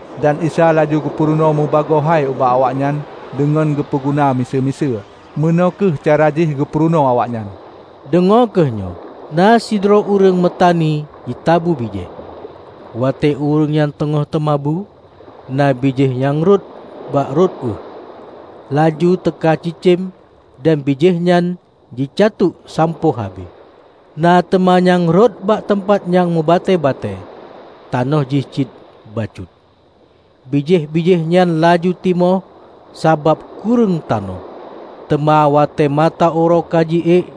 Dan Isa laju geupeurunoe meubagoe hai ubak awaknyan deungon geupeu guna miseue-miseue. Meunoe kheueh cara jih geupeurunoe awaknyan. "Deungoe kheueh nyoe! Na sidroe ureuëng meutani jitabu bijéh. Watée ureuëng nyang teungoh teumabu, na bijéh nyang rhot bak rot ueh. Laju teuka cicém dan bijéh nyan jicatuek sampoe habéh. Na teuma nyang rhot bak teumpat nyang meubatée-batée tanoh jih cit bacut. Bijéh-bijéh nyan laju timoh sabab kureueng tanoh, teuma watée mata uroe ka ji ék,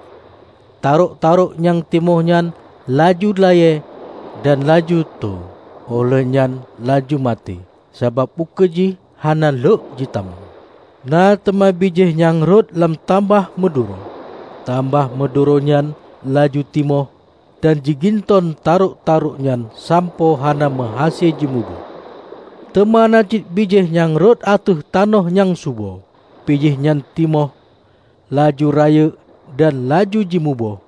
tarôk-tarôk nyang timoh nyan laju layée dan laju tho óh lheueh nyan laju maté sabab ukeue jih hana lhok jitamong. Na teuma bijéh nyang rhot lam tamah meuduro. Tamah meuduro nyan laju timoh dan jiginton tarôk-tarôk nyan sampoe hana meuhase jimuboh. Teuma na cit bijéh nyang rhot ateueh tanoh nyang subo. Bijéh nyan timoh, laju rayeuk dan laju jimuboh,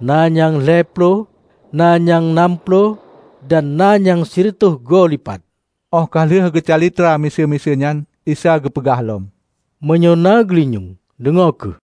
na nyang lhée ploh, na nyang nam ploh, dan na nyang sireutôh go lipat." Óh ka lheueh geucalitra miseue-miseue nyan, Isa geupeugah lom, "Meunyoe na geulinyueng, deungoe kheueh!"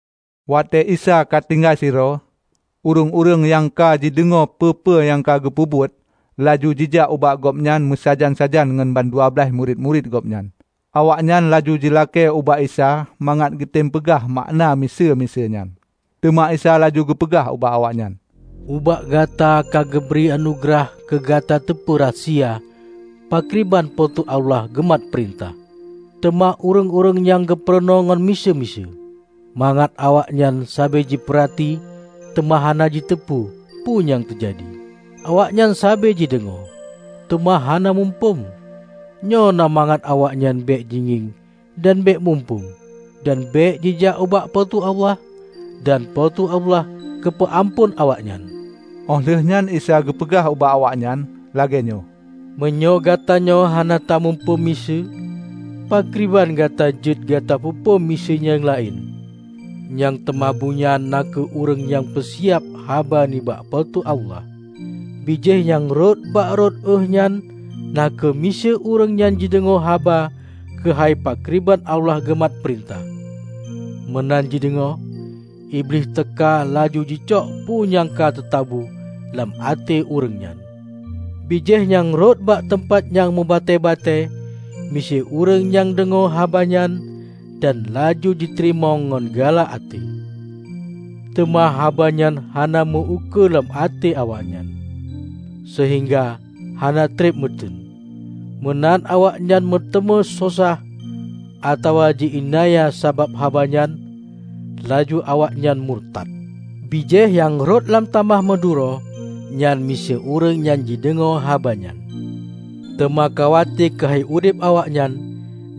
Watée Isa ka tinggai sidroe, ureuëng-ureuëng nyang ka jideungoe peue-peue nyang ka geupeubeuet, laju jijak ubak Gobnyan meusajan-sajan ngon bandua blaih droe murit-murit Gobnyan. Awaknyan laju jilakée ubak Isa mangat geutém peugah makna miseue-miseue nyan. Teuma Isa laju geupeugah ubak awaknyan, "Ubak gata ka geubri anugeurah keu gata teupeu rahsia pakriban Po teu Allah geumat peurintah. Teuma ureuëng-ureuëng nyang geupeurunoe ngon miseue-miseue, mangat 'Awaknyan sabe jipeurati teuma hana jiteupeu peue nyang teujadi, awaknyan sabé jideungoe, teuma hana muphom, nyoe na mangat awaknyan bék jingieng dan bék muphom dan bék jijak ubak Po teu Allah dan Po teu Allah geupeu amphon awaknyan.' " Óh lheueh nyan Isa geupeugah ubak awaknyan lagée nyoe, "Meunyoe gatanyoe hana tamuphom miseue, pakriban gata jeuet gata peuphom miseue nyang laén? Nyang teumabu nyan na kheueh ureuëng nyang peusiab haba nibak Po teu Allah. Bijéh nyang rhot bak rot ueh nyan na kheueh miseue ureuëng nyang jideungoe haba keuhai pakriban Allah geumat peurintah. Meunan jideungoe, Iblih teuka laju jicok peue nyang ka teutabu lam até ureuëng nyan. Bijéh nyang rhot bak teumpat nyang meubatée-batée miseue ureuëng nyang deungoe haba nyan, dan laju jiteurimong ngon galak até. Teuma haba nyan hana meu-ukeue lam até awaknyan, seuhingga hana treb meuteuen. Meunan awaknyan meuteumé sosah atawa ji-iénanya sabab haba nyan, laju awaknyan murtat. Bijéh nyang rhot lam tamah meuduro nyan miseue ureuëng nyang jideungoe haba nyan, teuma khawate keuhai udeb awaknyan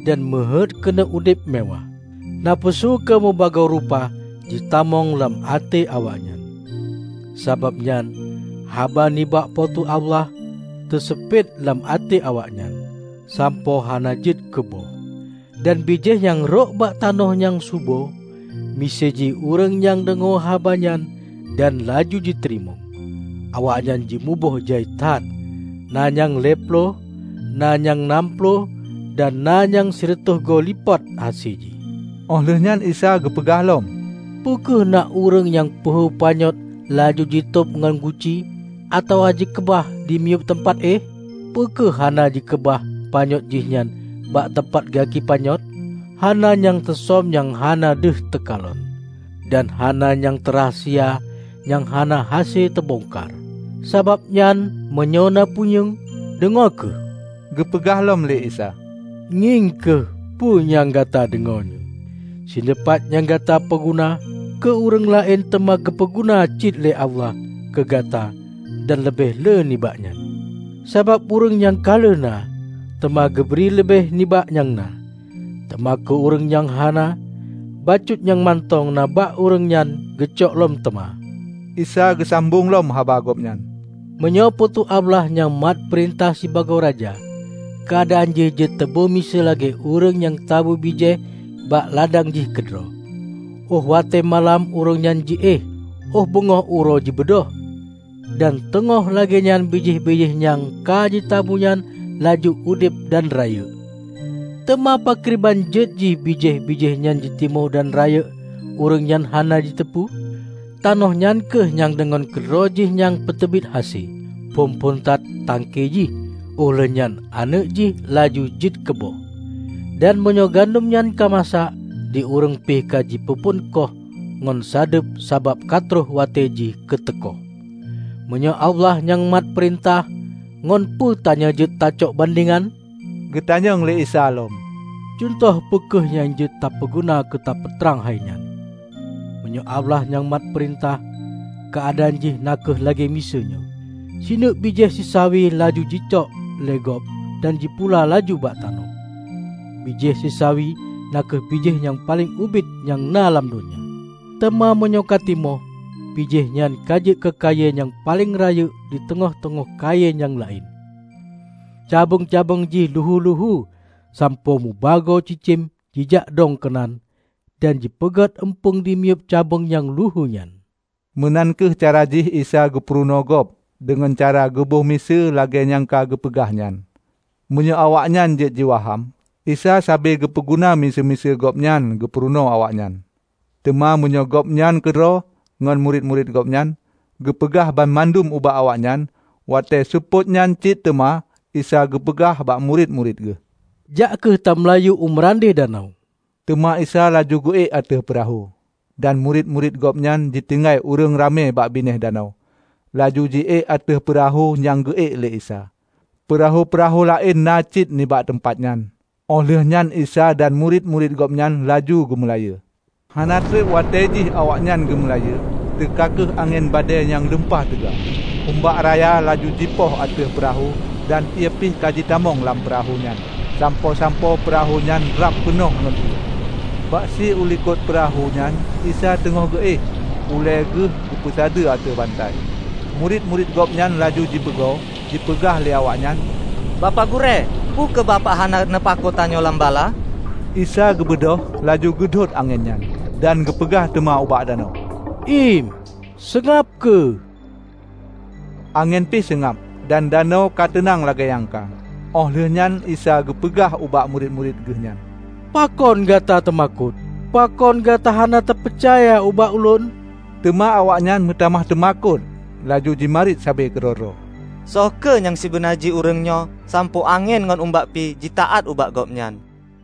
dan meuheuét keuneuk udeb mewáh. Nafeusu keu meubagoe rupa jitamong lam até awaknyan. Sabab nyan haba nibak Po teu Allah teuseupet lam até awaknyan, sampoe hana jeuet keu boh. Dan bijéh nyang rhot bak tanoh nyang subo miseue jih ureuëng nyang deungoe haba nyan dan laju jiteurimong, awaknyan jimuboh jai that, na nyang lhée ploh, na nyang nam ploh, dan na nyang sireutôh goe lipat hase jih." Óh lheueh nyan Isa geupeugah lom, "Peu kheueh na ureuëng nyang peuhu panyöt laju jitôb ngon guci, atawa jikeubah dimiyueb teumpat éh? Peu kheueh hana jikeubah panyöt jihnyan bak gaki panyöt? Hana nyang teusöm nyang hana deuh teukalon; dan hana nyang teurahsia nyang hana hase teubongkar. Sabab nyan meunyoe na punyueng, deungoe kheueh!" Geupeugah lom lé Isa, "Ngieng kheueh peue nyang gata deungoe nyoe! Sineupat nyang gata peuguna keu ureuëng laén teuma geupeu guna cit lé Allah keu gata dan leubeh lé nibak nyan. Sabab ureuëng nyang ka lheueh na, teuma geubri leubeh nibak nyang na; teuma keu ureuëng nyang hana, bacut nyang mantong na bak ureuëng nyan geucok lom teuma." Isa geusambong lom haba Gobnyan, "Meunyoe Po teu Allah nyang mat peurintah sibagoe raja, keuadaan jih jeuet teuboh miseue lagée ureuëng nyang tabu bijéh bak ladang jih keudroe. Óh watée malam ureuëng nyan ji-éh; óh beungoh uroe jibeudôh. Dan teungoh lagée nyan bijéh-bijéh nyang ka jitabu nyan laju udeb dan rayeuk. Teuma pakriban jeuet jih bijéh-bijéh nyan jitimoh dan rayeuk, ureuëng nyan hana jiteupeu. Tanoh nyan kheueh nyang deungon keudroe jih nyang peuteubiet hase: phon-phon that tangke jih, óh lheueh nyan aneuëk jih laju jeuet keuboh. Dan meunyoe gandom nyan ka masak, di ureuëng pih ka jipeuphon koh ngon sadeueb sabab ka troh watée jih keu teukoh." "Meunyoe Allah nyang mat peurintah, ngon peue tanyoe jeuet tacok bandengan?" geutanyong lé Isa lom. "Cuntoh peu kheueh nyang jeuet tapeuguna keu tapeutrang hainyan? Meunyoe Allah nyang mat peurintah, keuadaan jih na kheueh lagée miseue nyoe: Sineuk bijéh sisawi laju jicok lé gob dan jipula laju bak tanoh. Bijéh sisawi na kheueh bijéh nyang paleng ubit nyang na lam donya. Teuma meunyoe ka timoh, bijéh nyan ka jeuet keu kayée nyang paleng rayeuk di teungoh-teungoh kayée nyang laén. Cabeueng-cabeueng jih luhu-luhu sampoe mubagoe cicém jijakdong keunan, dan jipeugét eumpung dimiyueb cabeueng nyang luhu nyan." Meunan kheueh cara jih Isa geupeurunoe gob deungon cara geuboh miseue lagée nyang ka geupeugah nyan, meunyoe awaknyan jeuet jiwaham. Isa sabe geupeu guna miseue meunyoe Gobnyan geupeurunoe awaknyan. Teuma meunyoe Gobnyan keudroe ngon murit-murit Gobnyan, geupeugah banmandum ubak awaknyan. Watée seupôt nyan cit teuma, Isa geupeugah ubak murit-murit Geuh, "jak kheueh tameulayeue u meurandeh danau." Teuma Isa laju geu-ék ateueh peurahô, dan murit-murit Gobnyan jitinggai ureuëng ramé bak binéh danau, laju ji-ék ateueh peurahô nyang geu-ék lé Isa. Peurahô-peurahô laén na cit nibak teumpat nyan. Óh lheueh nyan Isa dan murit-murit Gobnyan laju geumeulayeue. Hana treb watée jih awaknyan geumeulayeue, teuka kheueh angén badée nyang lumpah teuga. Umbak raya laju jipoh ateueh peurahô dan ié pih ka jitamong lam peurahô nyan sampoe-sampoe peurahô nyan rab peunoh ngon ié. Bak si ulikot peurahô nyan Isa teungoh geu-éh ulée Geuh geupeusadeue ateueh bantai. Murit-murit Gobnyan laju jipeugoe. Jipeugah lé awaknyan, "Bapak Gurée, peu kheueh Bapak hana neupakoe, tanyoe lam bala?" Isa geubeudôh, laju geudhôt angén nyan, dan geupeugah teuma ubak danau, "Iem, seungab kheueh!" Angén pih seungab, dan danau ka teunang lagée nyang ka. Óh lheueh nyan Isa geupeugah ubak murit-murit Geuhnyan, "Pakon gata teumakot? Pakon gata hana tapeucaya ubak ulôn"? Teuma awaknyan meutamah teumakot laju jimarit sabe keudroe-droe, "Soe kheueh nyang sibeuna jih ureuëng nyoe, sampoe angén ngon umbak pih jitaát ubak Gobnyan."